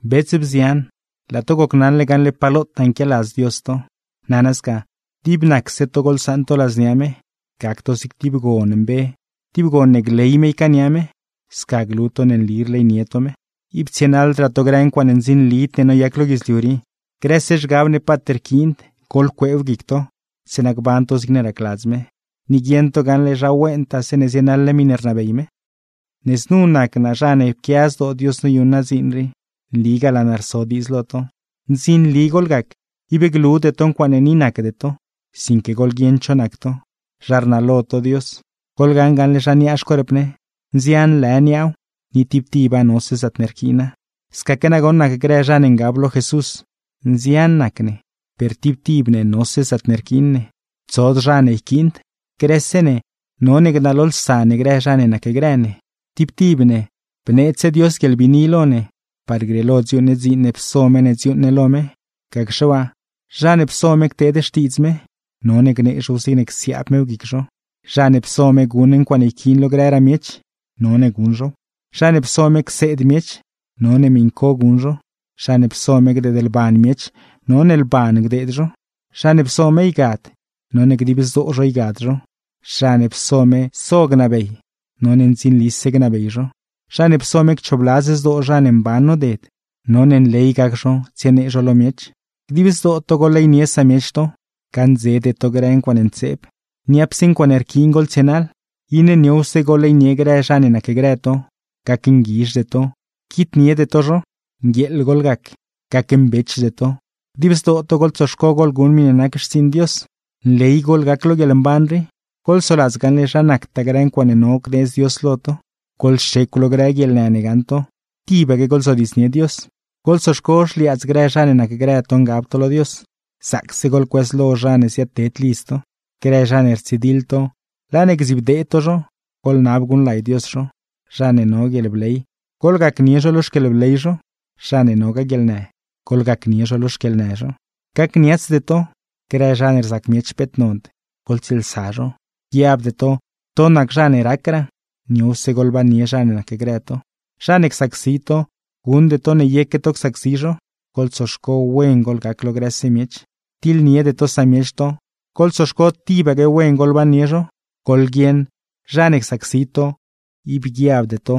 Bets, bzian, laa to gocnaṉle gaṉle pa lotaa nquialadz Dios to. Nana sca, dib nacse to goḻsaṉ to ladznia me, gac to zig tib gon mbe, tib gon ne gley me ycaania me. Sca glu to ne nli rleynie to me. Ib tsienaḻdraa to grë ncuaaṉe ndzinlid ne noyac lo guidzliu rii, grëse zhgab ne paat rquiind, goḻcueew guic to; zeeṉa gban to zigne racladz me, ni guieṉ to gaṉle zha wentaaw zeeṉe zienaḻ ne miṉe rnabey me. Ne znu nac naa zha ne pquia zdoo Dios noyuṉ naa dziin rii, nligaa laa naa rso diidz lo to, ndzinli goḻgac, ib glude to ncuaaṉe ni nacde to, sinque goḻguieṉ cho nac to, zha rnalo to Dios. Goḻgaṉ gaṉle zha niaa xcuerp ne: nzian lë niaaw, ni tib tiba nose zaatne rquiina; scaque nagoṉ nac grë zha ne ngab lo Jesús, nzian nac ne, per tib tib ne nose zaatne rquiin ne, tsod zha ne yquiind. Grëse ne none gnalolsa ne grë zha ne nacgrë ne. Tib tib ne bneedzse Dios guieḻbiini lo ne, par grieelo dziuuṉ ne dziin ne pso me ne dziuuṉ ne lo me. Gacxe waa, zha ne pso me cteed xtiidz me, none gnee zhow zigne csiaab mew guic zho; zha ne pso me guṉ ncuaaṉe yquiin lo grëraa miech, none guṉ zhow. Zha ne pso me cseed miech, none miṉ co guṉ zho; zha ne pso me gdeedlban miech, none lban gdeed zho. Zha ne pso me ygad, none dib zdoo zho ygad zho; zha ne pso me so gnabey, none ndzinlise gnabey zho; zha ne pso me cchoobladz zdoo zha ne mban noded, none nley gac zho tsienee zho lo miech. Dib zdoo to goḻleynie samiech to. Gaṉdzede to grë ncuaaṉe ntseeb, niapse ncuaaṉe rquiin goḻtsienaḻ. Iṉe niowse goḻleynie grë zha ne nacgrë to, gacnguizhde to, quitniede to zho. Nguieeḻ goḻgac, gacmbechde to, dib zdoo to goḻtsoxco goḻguṉ miṉe nac xtsiiṉ Dios. Nley goḻgac lo guieḻmban rii, goḻsoladz gaṉle zha nactaa grë ncuaaṉe no gneedz Dios lo to; goḻxecw lo grë guieḻnë ne gaṉ to; tibaque goḻzodiidznie Dios. Goḻtsoxco xliaadz grë zha ne nacgrë to ngab to lo Dios; zaacse goḻcuëzlo zha ne ziaadted lidz to. Grë zha ne rtsidiḻ to, laa ne gdzibdee to zho, goḻnab guṉlay Dios zho. Zha ne no guieḻbley, goḻgacnie zho lo xquieḻbley zho; zha ne nogaa guieḻnë, goḻgacnie zho lo xquieḻnë zho. Gacniatsde to. Grë zha ne rzac miech peet nond, goḻtsieelsa zho; guiabde to to nac zha ne racraa. Niowse goḻbannie zha ne nacgrë to. Zha ne csacsi to, guṉde to ne yeque to csacsi zho. Goḻtsoxco wen goḻgac lo grëse miech. Tiḻniede to samiech to, goḻtsoxco tibaque wen goḻbannie zho. Goḻguieṉ, zha ne csacsi to, ib guiabde to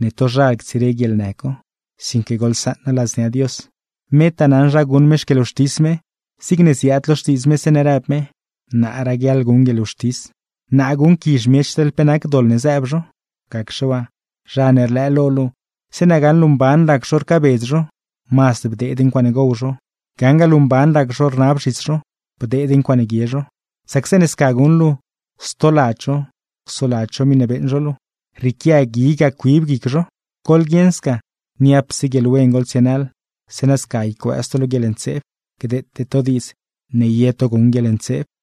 ne tozhal ctsire guieḻnë co, sinque goḻsaṉa ladznia Dios, metaa naṉ zha guṉ me xquieḻwxtis me; zigne ziaad lo Xtiidz me zeeṉe rëb me: “Naa raguiaḻ guṉ guieḻwxtis, naa guṉquizh miech teḻ pe nac doḻ ne zëëb zho. Gacxe waa, zha ne rlëë lo luu, zeeṉe gaṉ luu mban rac zho rcaabedz zho, mazd bdeed ncuaaṉe gow zho; gaṉgaa luu mban rac zho rnab zhis zho, bdeed ncuaaṉe guie zho. Sac zeeṉe sca guṉ luu, stoladz zho csoladz zho miṉe beeṉ zho luu; rrieequia gui ga cuib guic zho.” Goḻguieṉ sca, niapse guieḻwen goḻtsienaḻ, zeeṉa sca ycuëëz to lo guieḻntseeb. Gdeete to diidz ne ye to guṉ guieḻntseeb.